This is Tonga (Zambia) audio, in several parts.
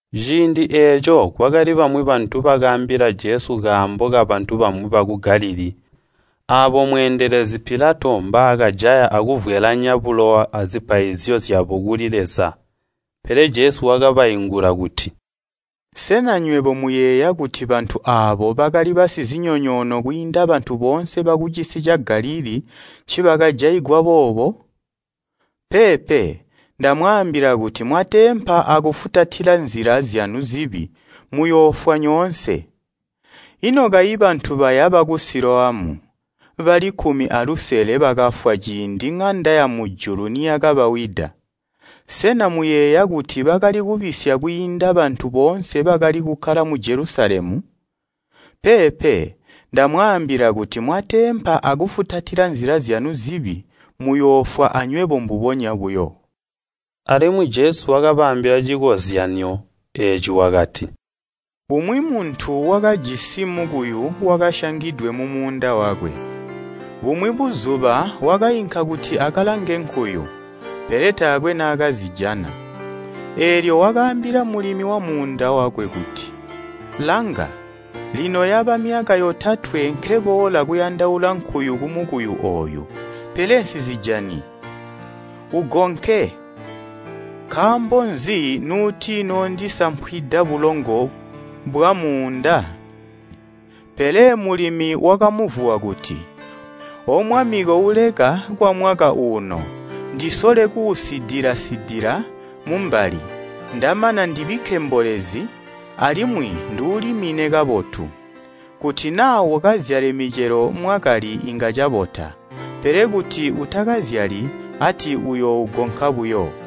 Ciindi eeco kwakali bamwi bantu bakaambila Jesu kaambo kabantu bamwi baku Galilii aabo mweendelezi Pilato mbaakajaya akuvwelaanya bulowa azipaizyo zyabo kuli Leza. Pele Jesu wakabaingula kuti, “Sena nywebo muyeeya kuti bantu aabo bakali basizinyonyoono kwiinda bantu boonse bakucisi ca Galilii ncibakajaigwa boobo? Peepe! Ndamwaambila kuti mwateempa akufutatila nzila zyanu zibi muyoofwa nyoonse. Ino kayi bantu baya baku Siloamu bali kkumi alusele bakafwa ciindi ŋanda yamujulu niyakabawida? Sena muyeeya kuti bakali kubisya kwiinda bantu boonse bakali kukkala mu Jelusalemu? Peepe! Ndamwaambila kuti mwateempa akufutatila nzila zyanu zibi muyoofwa anywebo mbubonya buyo.” Alimwi Jesu wakabaambila cikozyanyo eeci wakati, “Umwi muntu wakajisi mukuyu wakasyangidwe mumuunda wakwe. Bumwi buzuba wakainka kuti akalange nkuyu, pele taakwe naakazijana. Eelyo wakaambila mulimi wamuunda wakwe kuti, ‘Langa, lino yaba myaka yotatwe nkeboola kuyandaula nkuyu kumukuyu ooyu, pele nsizijani. Ugonke, nkaambo nzi nuutinoondisampwida bulongo bwamuunda?’ Pele mulimi wakamuvuwa kuti, ‘Omwami kouleka kwamwaka uuno, ndisole kuusidila-sidila mumbali, ndamana ndibikke mbolezi, alimwi nduulimine kabotu. Kuti naa ukazyale micelo mwakali inga cabota, pele kuti utakazyali, ati uyoougonka buyo.’”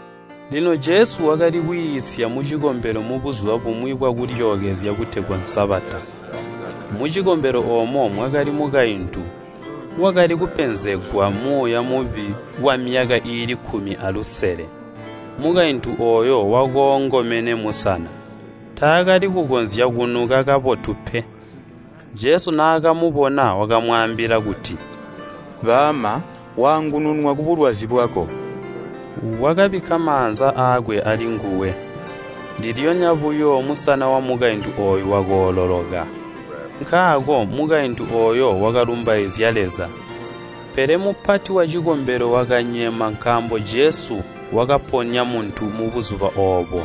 Lino Jesu wakali kwiisya mucikombelo mu Buzuba bumwi bwa Kulyookezya butegwa Sabata. Mucikombelo oomo mwakali mukaintu, wakali kupenzegwa muuya mubi kwamyaka iili kkumi alusele. Mukaintu ooyo wakoongomene musana, taakali kukonzya kunuka kabotu pe. Jesu naakamubona wakamwaambila kuti, “Baama, waangununwa kubulwazi bwako!” Wakabikka maanza aakwe alinguwe. Ndilyonya buyo musana wamukaintu ooyo wakoololoka. Nkaako mukaintu ooyo wakalumbaizya Leza. Pele mupati wacikombelo wakanyema nkaambo Jesu wakaponya muntu mubuzuba oobo.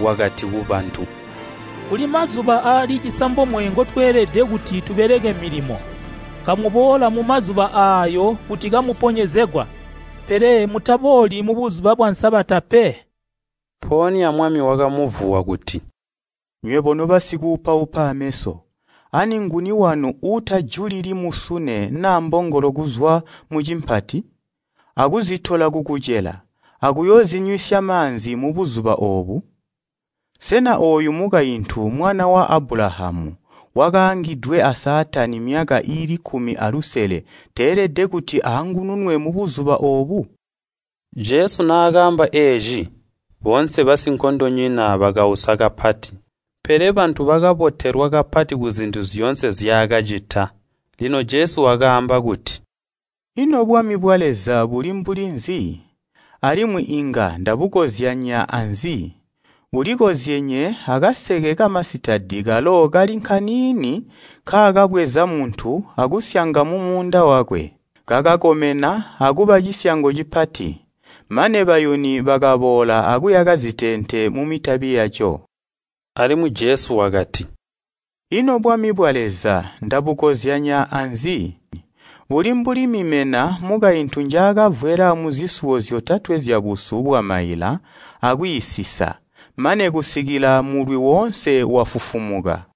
Wakati kubantu, “Kuli mazuba aali cisambomwe ngotweelede kuti tubeleke milimo. Kamuboola mumazuba aayo kuti kamuponyezegwa, pele mutabooli mu Buzuba bwa Sabata pe!” Mpoonya Mwami wakamuvuwa kuti, “Nywebo nobasikuupaupa ameso! Ani nguni wanu uutajulili musune naa mbongolo kuzwa mucimpati, akuzitola kukucela akuyoozinywisya maanzi mubuzuba oobu? Sena ooyu mukaintu mwana wa Abulahamu wakaangidwe a Saatani myaka iili kkumi alusele teelede kuti aangununwe mubuzuba oobu?” Jesu naakamba eeci, boonse basinkondonyina bakausa kapati, pele bantu bakabotelwa kapati kuzintu zyoonse nzyaakacita. Lino Jesu wakaamba kuti, “Ino bwami bwa Leza buli mbuli nzi? Alimwi inga ndabukozyanya aanzi? Bulikozyenye akaseke kamasitadi kalo kali nkaniini nkaakabweza muntu akusyanga mumuunda wakwe, kakakomena akuba cisyango cipati, mane bayuni bakaboola akuyaka ziteente mumitabi yaco.” Alimwi Jesu wakati, “Ino bwami bwa Leza ndabukozyanya aanzi? Buli mbuli mimena mukaintu njaakavwela muzisuwo zyotatwe zyabusu bwamaila akwiisisa, mane kusikila mulwi woonse wafufumuka.”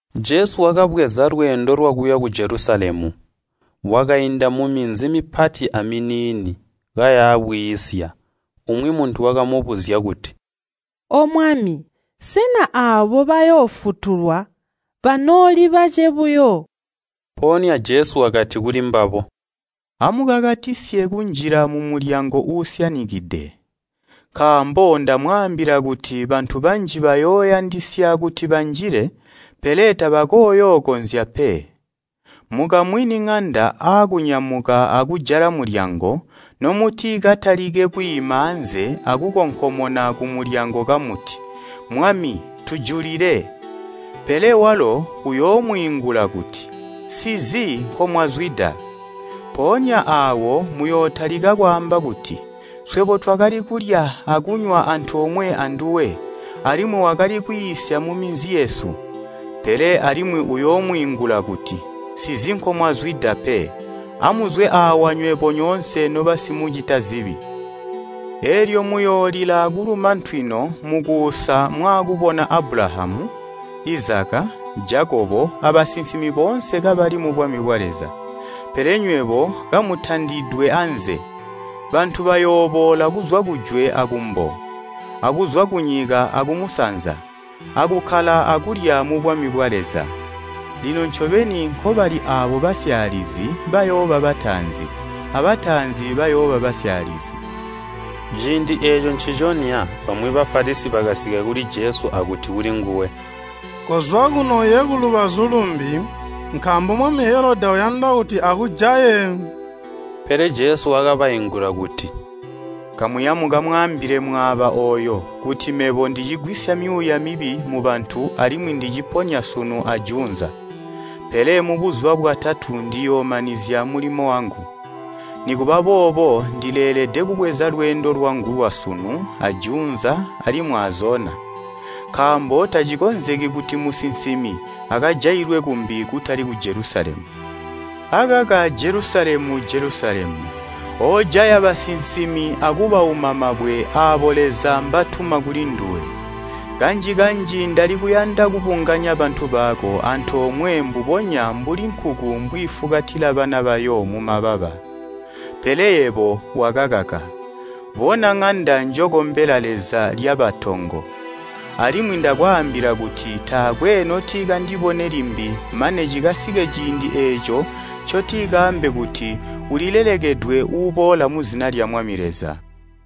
Jesu wakabweza lweendo lwakuya ku Jelusalemu. Wakainda muminzi mipati aminiini, kaya bwiisya. Umwi muntu wakamubuzya kuti, “Omwami, sena aabo bayoofutulwa banooli bace buyo?” Mpoonya Jesu wakati kulimbabo, “Amukakatisye kunjila mumulyango uusyanikide, nkaambo ndamwaambila kuti bantu banji bayooyandisya kuti banjile, pele tabakooyookonzya pe. Mukamwini ŋanda aakunyamuka akujala mulyango nomutikatalike kwiima aanze akukonkomona kumulyango kamuti, ‘Mwami, tujulile!’ Pele walo uyoomwiingula kuti, ‘Nsizi nkomwazwida.’ Mpoonya aawo muyootalika kwaamba kuti, ‘Swebo twakali kulya akunywa antoomwe anduwe, alimwi wakali kwiisya muminzi yesu!’ Pele alimwi uyoomwiingula kuti, ‘Nsizi nkomwazwida pe. Amuzwe aawa nywebo nyoonse nobasimucita zibi.’ Eelyo muyoolila akuluma ntwino mukuusa mwaakubona Abulahamu, Izaka, Jakobo abasinsimi boonse kabali mubwami bwa Leza, pele nywebo kamutandidwe anze! Bantu bayooboola kuzwa kujwe akumbo, akuzwa kunyika akumusanza, akukkala akulya mubwami bwa Leza. Lino ncobeni nkobali aabo basyaalizi bayooba bataanzi, abataanzi bayooba basyaalizi.” Ciindi eeco nciconya bamwi Bafalisi bakasika kuli Jesu akuti kulinguwe, “Kozwa kuno uye kulubazu lumbi, nkaambo mwami Helodi uyanda kuti akujaye.” Pele Jesu wakabaingula kuti, “Kamuya mukamwaambile mwaaba ooyo kuti ‘Mebo ndicigwisya myuuya mibi mubantu alimwi ndiciponya sunu ajuunza, pele mubuzuba bwatatu ndiyoomanizya mulimo wangu.’ Nikuba boobo ndileelede kubweza lweendo lwangu lwasunu ajuunza alimwi azona, nkaambo tacikonzeki kuti musinsimi akajailwe kumbi kutali ku Jelusalemu. “Akaka Jelusalemu, Jelusalemu, oojaya basinsimi akubauma mabwe aabo Leza mbatuma kulinduwe! Kanji-kanji ndalikuyanda kubunganya bantu bako antoomwe mbubonya, mbuli nkuku mbwiifukatila bana bayo mumababa, pele yebo wakakaka! Bona ŋanda njokombela Leza lyaba tongo. Alimwi ndakwaambila kuti taakwe notikandibone limbi mane cikasike ciindi eeco ncotikaambe kuti, ‘Ulilelekedwe uuboola muzina lya Mwami Leza.’”